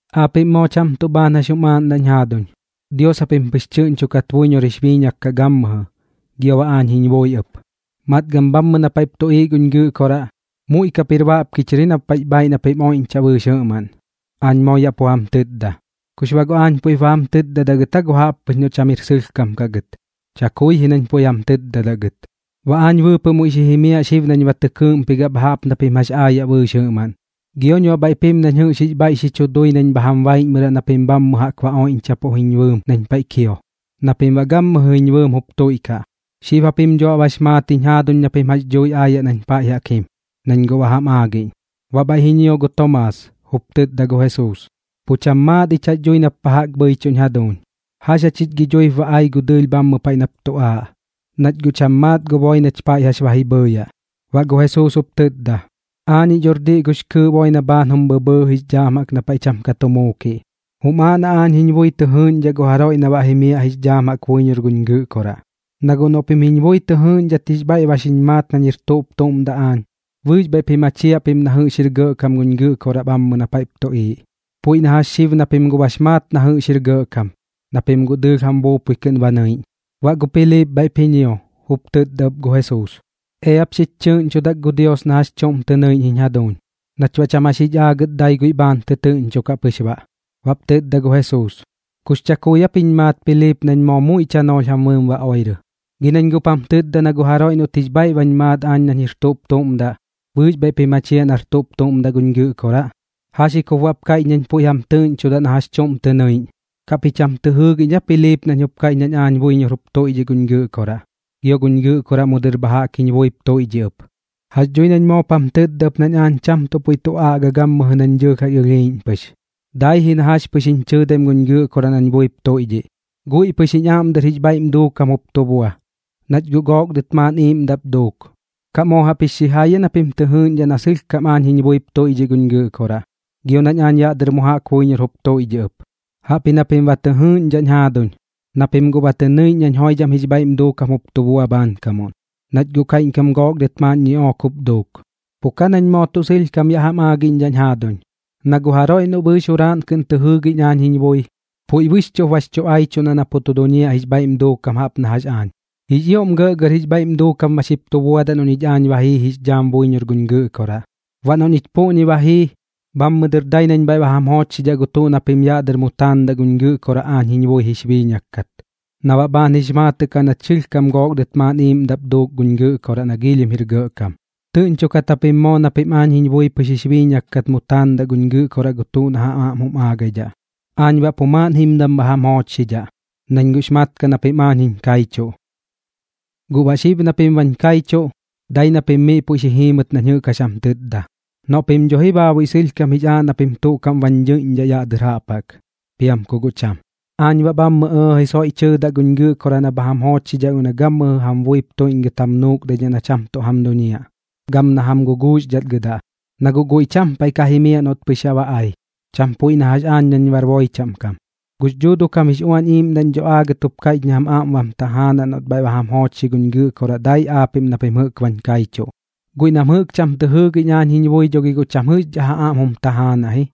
’Aapiꞌm moo cham tuꞌ bhaan jax jum aaꞌndaꞌñ jaaduñ, Dios japim pɨx tɨꞌñchokat buiñor jix biiñak kaꞌ gammɨjɨ, gio baꞌ aañ jiñ bui ɨp. Matgam bhammɨ na paiꞌp tuꞌiiꞌ guñ Gɨꞌkoraꞌ, muiꞌ kap jir baꞌpki chɨr ji na paiꞌx bhaaiꞌ na pim oiꞌñchaꞌ bɨɨx jɨꞌmaꞌn, aañ moo yaꞌ pu jam tɨtda. ¿Kux baꞌ guꞌ aañ puiꞌp ba jam tɨtdadaꞌ gɨt aa gu jaꞌp pɨx noꞌ cham jir sɨlhkam kaꞌ gɨt? Chakui ji nañ puiꞌ jam tɨɨdaꞌ gɨt. Baꞌ aañ bɨɨpɨꞌ muiꞌ xi jimiaꞌ xib nañ ba tɨ kɨɨꞌmpigaꞌ bha jaꞌp na pim jax aayaꞌ bɨɨx jɨꞌmaꞌn. Gioñ baꞌ bhaiꞌp jim nañ jɨꞌx jix bhaiꞌ xi chu dui nañ bha jam baiꞌñmɨraꞌ na pim bhammɨ jaꞌk ba oiꞌñchapuꞌ jiñ bɨɨm nañ paiꞌ kio, na pim baꞌ gammɨjɨ jiñ bɨɨm jup tuiꞌkaꞌ. Xib japim dho baꞌ bax maat jiñ jaaduñ na pim jax dhui aayaꞌ nañ paiꞌ jaꞌk jim, nañ guꞌ ba jam aagiꞌñ. Baꞌ bhaiꞌ ji ñio gu Tomaas, jup tɨtda gu Jesuus: ―Pu cham maat ich jax dhui nap pa jaꞌk bhɨichuꞌñ jaduuñ. ¿Jax jachich gi dhuip ba ai gu dɨɨlh bhammɨ paiꞌ nap tu aaꞌ, nach guꞌ cham maat gu boi nach paiꞌ jax ji bhɨɨyaꞌ? Baꞌ gu Jesuus jup tɨtda: ―Aañiꞌ dhor diꞌ gux kɨɨꞌ boi na bhaan jum bhɨbhɨɨ jix dhaam jaꞌk na paiꞌ cham ka tu muukiꞌ. Jum aaꞌ na aañ jiñ bui tɨ jɨɨꞌñdhaꞌ gu jaroiꞌ na baꞌ jimiaꞌ jix dhaam jaꞌk buiñor guñ Gɨꞌkoraꞌ. Na guꞌ noꞌ pim jiñ bui tɨ jɨɨꞌñdhat jix bhaiꞌ ba xiñ maat nañ jir tuꞌp tuꞌm daꞌ aañ, bɨɨx bhaiꞌ ji machiaꞌ pim na jɨꞌx jir gɇꞌkam guñ Gɨꞌkoraꞌ bhammɨ na paiꞌp tuꞌiiꞌ. Puiꞌ na jax xib na pim guꞌ bax maat na jɨꞌx jir gɇꞌkam, na pim guꞌ dɨɨlh jam buupui kɨꞌn ba nɨiꞌñ. Baꞌ gu Piliip bhaiꞌp ji ñio, jup tɨtda ɨp gu Jesuus: ―Eap xich chɨɨꞌñchodak gu Dios na jax chuꞌm tɨ nɨiꞌñ jiñ jaduuñ, nach baꞌ cham jax jich aagɨt dai guiꞌ bhaan tɨtɨɨꞌñchokaꞌ pɨx baꞌ. Baꞌp tɨtda gu Jesuus: ―¿Kux chakui aap jiñ maat Piliip nañ moo muiꞌ chanoolh jam bɨɨm ba oirɨ? Gi nañ jup jam tɨtda na gu jaroiꞌ noꞌt jix bhaiꞌ bañ maat aañ nañ jir tuꞌp tuꞌm daꞌ, bɨɨx bhaiꞌp ji machiaꞌ nar tuꞌp tuꞌm daꞌ guñ Gɨꞌkoraꞌ. ¿Jax ji kup baꞌp kaiꞌch nañ puiꞌ jam tɨɨꞌñchodaꞌ na jax chuꞌm tɨ nɨiꞌñ? ¿Kaꞌp ji cham tɨ jɨɨgiꞌñ aa Piliip nañ jup kaiꞌch nañ aañ buiñor jup tuiꞌdhiꞌ guñ Gɨꞌkoraꞌ, gio na guñ Gɨꞌkoraꞌ mu dɨr bha jaꞌk jiñ buip tuiꞌdhiꞌ ɨp? Jax dhui nañ moop jam tɨtda ɨp nañ aañ cham tuꞌ puiꞌ tu aꞌga gammɨjɨ nañ dɨɨlh jax ɨlhiiꞌñ pɨx, daipuꞌ ji na jax pɨx jiñ chɨɨdaim guñ Gɨꞌkoraꞌ nañ buip tuiꞌdhiꞌ. Guiꞌ pɨx jiñ aꞌm dɨr jix bhaiꞌm duukam jup tu bua, nach guꞌ gook dɨt maaꞌn iiꞌmdaꞌp duuk. ¿Kaꞌ moo jaꞌp jix xijai aa na pim tɨ jɨɨꞌñdhaꞌ na sɨlhkam aañ jiñ buip tuiꞌdhiꞌ guñ Gɨꞌkoraꞌ, gio nañ aañ yaꞌ dɨr mu jaꞌk buiñor jup tuiꞌdhiꞌ ɨp? Jaꞌpji na pim ba tɨ jɨɨꞌñdhaꞌñ jaaduñ, na pim guꞌ ba tɨ nɨiꞌñ nañ joidham jix bhaiꞌm duukam jup tu bua bhaankamuꞌn, nach guꞌ kaiꞌñkam gook dɨt maaꞌn ñiꞌook jup duuk. Pu ka nañ moo tuꞌ sɨlhkam yaꞌ jam aagiꞌñdhaꞌñ jaaduñ, na gu jaroiꞌ noꞌ bɨɨx juraaꞌn kɨꞌn tɨ jɨɨgiꞌñ aañ jiñ bui, puiꞌ bɨxchuꞌp bax chu aichuꞌndaꞌ na pu tu duñiaꞌ jix bhaiꞌm duukam jaꞌp na jax aañ. Jix ioꞌm gɇꞌgɇr jix bhaiꞌm duuꞌnkam ba xip tu buadaꞌ noꞌ ñich aañ ba jiix dhaam buiñor guñ Gɨꞌkoraꞌ. Baꞌ noꞌ ñich puꞌñi ba jii, bhammɨ dɨr dai nañ bhaiꞌ ba jam joochxiꞌñdhaꞌ gu tuꞌ na pim yaꞌ dɨr mu taandaꞌ guñ Gɨꞌkoraꞌ aañ jiñ bui jix biiñak kat, na baꞌ bhaan jix maatɨꞌ kaꞌ nach sɨlhkam gook dɨt maaꞌn iiꞌmdaꞌ pɨx jup duuk guñ Gɨꞌkoraꞌ na giilhim jir gɇꞌkam. Tɨꞌñchokat japim moo na pim aañ jiñ bui pɨx jix biiñak kat mu taandaꞌ guñ Gɨꞌkoraꞌ gu tuꞌ na jam aꞌm jum aagaidhaꞌ. Aañ baꞌ pu maaꞌn jimdam bha jam joochxidhaꞌ, nañ guꞌx mat kaꞌ na pim aañ jiñ kaichuꞌ. ’Guꞌ baꞌ xib na pim bañ kaichuꞌ, dai na pim miꞌ puiꞌ xi jiimɨt nañ jɨꞌk jax jam tɨtda, noꞌ pim dho ji baabuiꞌ sɨlhkam jix aaꞌ na pim tuꞌ kaꞌm bañ ñɨiꞌñdhaꞌ yaꞌ dɨr jaꞌp jaꞌk, piam ku guꞌ cham. Aañ baꞌ bhammɨ ɇɇji soiꞌ tɨɨdaꞌ guñ Gɨꞌkoraꞌ na bha jam joochxidhaꞌ guiꞌ na gammɨjɨ jam buip tuiꞌñgɨt jam nuukdaidhaꞌ na cham tuꞌ jam duñiaꞌ, gam na jam guguuxdhatgɨdaꞌ, na guꞌ guiꞌ cham paiꞌ ka jimiaꞌ noꞌt pɨx yaꞌ ba ai, cham puiꞌ na jax aañ nañ bar boi chaꞌm kam. Gux Dhuuduꞌ kam jix Uañ Iiꞌmdaꞌñ dho aagɨt jup kaiꞌch na jam aꞌm bam tajaanaꞌ noꞌt bhaiꞌ ba jam joochxi guñ Gɨꞌkoraꞌ dai aapiꞌm na pim jɨꞌk bañ kaichuꞌ. Guiꞌ nam jɨꞌk cham tɨ jɨɨgiꞌñ aañ jiñ bui dho gi guꞌ cham jɨꞌxdhaꞌ ja aꞌm jum tajaanaꞌ ji,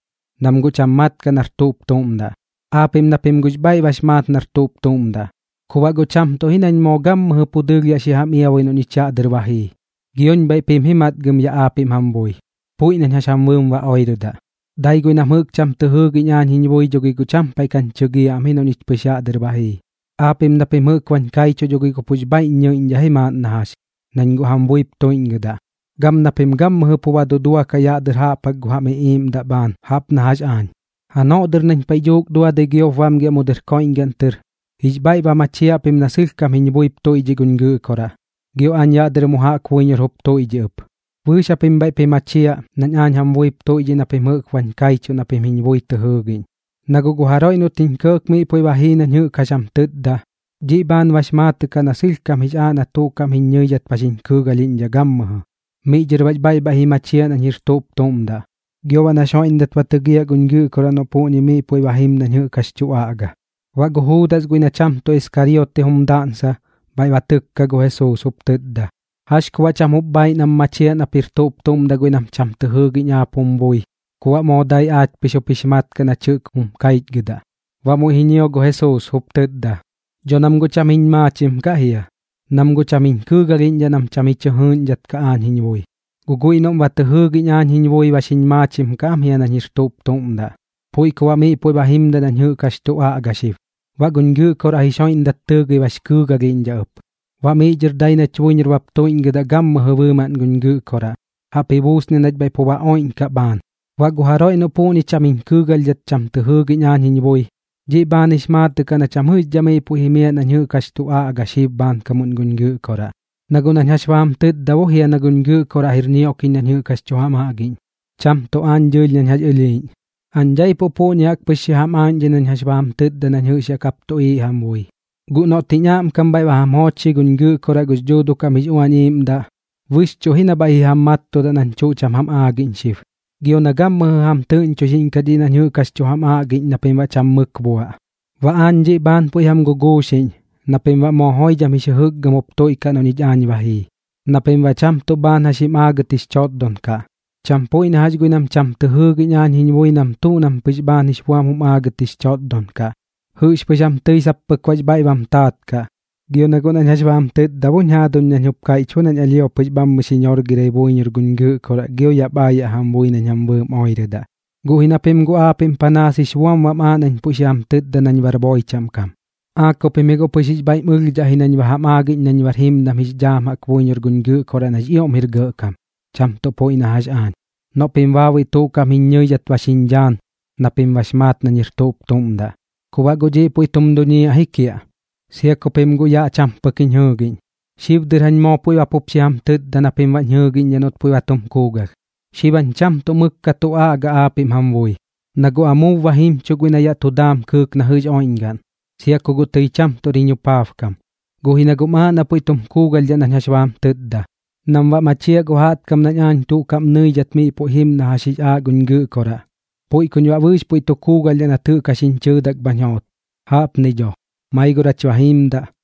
nam guꞌ cham mat kaꞌ nar tuꞌp tuꞌm daꞌ. Aapiꞌm na pim guꞌx bhaiꞌ bax maat nar tuꞌp tuꞌm daꞌ. Ku baꞌ guꞌ cham tuꞌ ji nañ moo gammɨjɨ pu dɨɨlh yaꞌ xi jam iabui noꞌ ñich yaꞌ dɨr ba jii, gioñ bhaiꞌp jim ji matgam yaꞌ aapiꞌm jam bui, puiꞌ nañ jax jam bɨɨm ba oirɨdaꞌ. Dai guiꞌ nam jɨꞌk cham tɨ jɨɨgiꞌñ aañ jiñ bui dho gi guꞌ pu cham paiꞌ kañ chɨgiaꞌ am ji noꞌ ñich pɨx yaꞌ dɨr ba jii. Aapiꞌm na pim jɨꞌk bañ kaichuꞌ dho gi guꞌ pux bhaiꞌñ ñɨiꞌñdhaꞌ ji maaꞌn na jax, nañ guꞌ jam buip tuiꞌñgɨdaꞌ, gam na pim gammɨjɨ pu ba duduakaꞌ yaꞌ dɨr jaꞌp jaꞌk gu jam iꞌiiꞌmdaꞌ bhaan jaꞌp na jax aañ. Janoꞌ dɨr nañ paiꞌ dhuuk duadɨi giop bamgiaꞌ mu dɨr koiꞌñgaꞌn tɨr, jix bhaiꞌ ba machiaꞌ pim na sɨlhkam jiñ buip tuiꞌdhiꞌ guñ Gɨꞌkoraꞌ, gio aañ yaꞌ dɨr mu jaꞌk buiñor jup tuiꞌdhiꞌ ɨp. Bɨɨx japim bhaiꞌp ji machiaꞌ nañ aañ jam buip tuiꞌdhiꞌ na pim jɨꞌk bañ kaichuꞌ na pim jiñ bui tɨ jɨɨgiꞌñ. Na guꞌ gu jaroiꞌ noꞌt jiñ kɇɇk miꞌ puiꞌ ba jii nañ jɨꞌk jax jam tɨtda, dhiꞌ bhaan bax maatɨꞌ kaꞌ na sɨlhkam jix aaꞌ na tuꞌ kaꞌm jiñ ñɨidhat ba xiñ kɨɨgalhiꞌñdhaꞌ gammɨjɨ, miꞌ dhɨr baꞌx bhaiꞌ bhaiꞌ ji machiaꞌ nañ jir tuꞌp tuꞌm daꞌ, gio baꞌ nax joiꞌndat ba tɨgiaꞌ guñ Gɨꞌkoraꞌ noꞌ puꞌñi miꞌ puiꞌ ba jim nañ jɨꞌk jax tu aꞌga. Baꞌ gu Juudas guiꞌ na cham tuꞌ Iskariote jum daꞌnsa bhaiꞌ ba tɨkka gu Jesuus, jup tɨtda: ―¿Jax ku baꞌ cham jup bhaaiꞌ nam machiaꞌ nap jir tuꞌp tuꞌm daꞌ guiꞌ nam cham tɨ jɨɨgiꞌñ aap jum bui ku baꞌ moo dai aach pɨx jup jix mat kaꞌ nach jɨꞌk jum kaichgɨdaꞌ? Baꞌ muiꞌ ji ñio gu Jesuus, jup tɨtda: ―Dho nam guꞌ cham jiñ maachim kaꞌ jia, nam guꞌ cham jiñ kɨɨgalhiꞌñdhaꞌ nam cham ji chɨ jɨɨꞌñdhat kaꞌ aañ jiñ bui. Guꞌ guiꞌ noꞌ ba tɨ jɨɨgiꞌñ aañ jiñ bui ba xiñ maachim kaꞌ ji nañ jir tuꞌp tum daꞌ, puiꞌ ku baꞌ miꞌ puiꞌ ba jimdaꞌ nañ jɨꞌk jax tu aꞌga xib, baꞌ guñ Gɨꞌkoraꞌ jix joiꞌndat tɨɨgɨi bax kɨɨgalhiꞌñdhaꞌ ɨp. Baꞌ miꞌ dhɨr dai nach buiñor bap tuiꞌñgɨdaꞌ gammɨjɨ bɨɨmaꞌn guñ Gɨꞌkoraꞌ, jaꞌp ji buusniaꞌ nach bhaiꞌ pu ba oiꞌñkaꞌ bhaan. Baꞌ gu jaroiꞌ noꞌ puꞌñi cham jiñ kɨɨgalhdhat cham tɨ jɨɨgiꞌñ aañ jiñ bui, dhiꞌ bhaan jix maatɨꞌ kaꞌ na cham jɨꞌxdhaꞌ miꞌ puiꞌ jimiaꞌ nañ jɨꞌk jax tu aꞌga xib bhaankamuꞌn guñ Gɨꞌkoraꞌ. Na guꞌ nañ jax ba jam tɨtda bo jia na guñ Gɨꞌkoraꞌ jir ñioꞌkiꞌñ dhiꞌ nañ jɨꞌk jax tu jam aꞌgiꞌñ, cham tuꞌ aañ dɨɨlh nañ jax ɨlhiiꞌñ. ’Aañ daipuꞌ puꞌñi jaꞌk pɨx xi jam aaꞌñdhai nañ jax ba jam tɨtda nañ jɨꞌx yaꞌ kap tuꞌiiꞌ jam bui. Guꞌ noꞌt jiñ aꞌmkam bhaiꞌ ba jam joochxi guñ Gɨꞌkoraꞌ gux Dhuuduꞌ kam jix Uañ Iiꞌmdaꞌ, bɨxchuꞌ ji na bhaiꞌ ji jam mattudaꞌ nañ tuꞌ cham jam aagiꞌñ xib, gio na gammɨjɨ jam tɨꞌñchoxiꞌñkaꞌ dhiꞌ nañ jɨꞌk jax tu jam aꞌgiꞌñ na pim baꞌ cham mɨk buaꞌ. ’Baꞌ aañ dhiꞌ bhaan puiꞌ jam guguuxiꞌñ, na pim baꞌ moo joidham jix jɨjɨkgɨm jup tuiꞌkaꞌ noꞌ ñich aañ ba jii, na pim baꞌ cham tuꞌ bhaan jax jim aagat jix chotdon kaꞌ. Cham puiꞌ na jax guiꞌ nam cham tɨ jɨɨgiꞌñ aañ jiñ bui nam tuꞌ na pɨx bhaan jix buam jum aagɨt jix chotdon kaꞌ, jɨꞌx pɨx jam tɨi sap pɨk baꞌx bhaiꞌ bam taat kaꞌ. Gio na guꞌ nañ jax ba jam tɨtdañ jaaduñ nañ jup kaiꞌch bo nañ alhio pɨx bhammɨ xi ñorgirai buiñor guñ Gɨꞌkoraꞌ gio yaꞌp aayaꞌ jam bui nañ jam bɨɨm oirɨdaꞌ. Guꞌ ji na pim guꞌ aapiꞌm panaas jix buam bam aaꞌ nañ puiꞌ xi jam tɨtda nañ bar boi chaꞌm kam. ¿Aa ku pim ji guꞌ pɨx jix bhaiꞌm ɨlhdhaꞌ ji nañ ba jam aagiꞌñ nañ bar jimdam jix dhaam buiñor guñ Gɨꞌkoraꞌ nax ioꞌm jir gɇꞌkam, cham tuꞌ puiꞌ na jax aañ, noꞌ pim baabuiꞌ tuꞌ kaꞌm jiñ ñɨidhat ba xiñ dhaan na pim bax maat nañ jir tuꞌp tuꞌm daꞌ? Ku baꞌ guꞌ dhiꞌ puiꞌ tum duñiaꞌ ji kiaꞌ, sia ku pim guꞌ yaꞌ cham pɨk jiñ jɨɨgiꞌñ. Xib dɨr jañ moo puiꞌ ba pup xi jam tɨtda na pim baꞌñ jɨɨgiꞌñdhaꞌ noꞌt puiꞌ ba tum kuugalh. ’Xib jañ cham tuꞌ mɨk ka tu aꞌgaꞌ aapiꞌm jam bui, na guꞌ amuub ba jimchuꞌ guiꞌ na yaꞌ tu daam kɨɨk na jɨꞌx oiꞌñgaꞌn, sia ku guꞌ tɨi cham tuꞌr jiñ jupaabkam. Guꞌ ji na guꞌm aaꞌ na puiꞌ tum kuugalhdhaꞌ nañ jax ba jam tɨtda, nam baꞌ machiaꞌ gu jaꞌtkam nañ aañ tuꞌ kaꞌm nɨidhat miꞌ puiꞌ jim na jax jix aaꞌ guñ Gɨꞌkoraꞌ, puiꞌ kuñ baꞌ bɨɨx puiꞌ tu kuugalhdhaꞌ nat jɨꞌk jax jiñ chɨɨdak bañ joot. Jaꞌpni dho. Maigor jach ba jiimdaꞌ.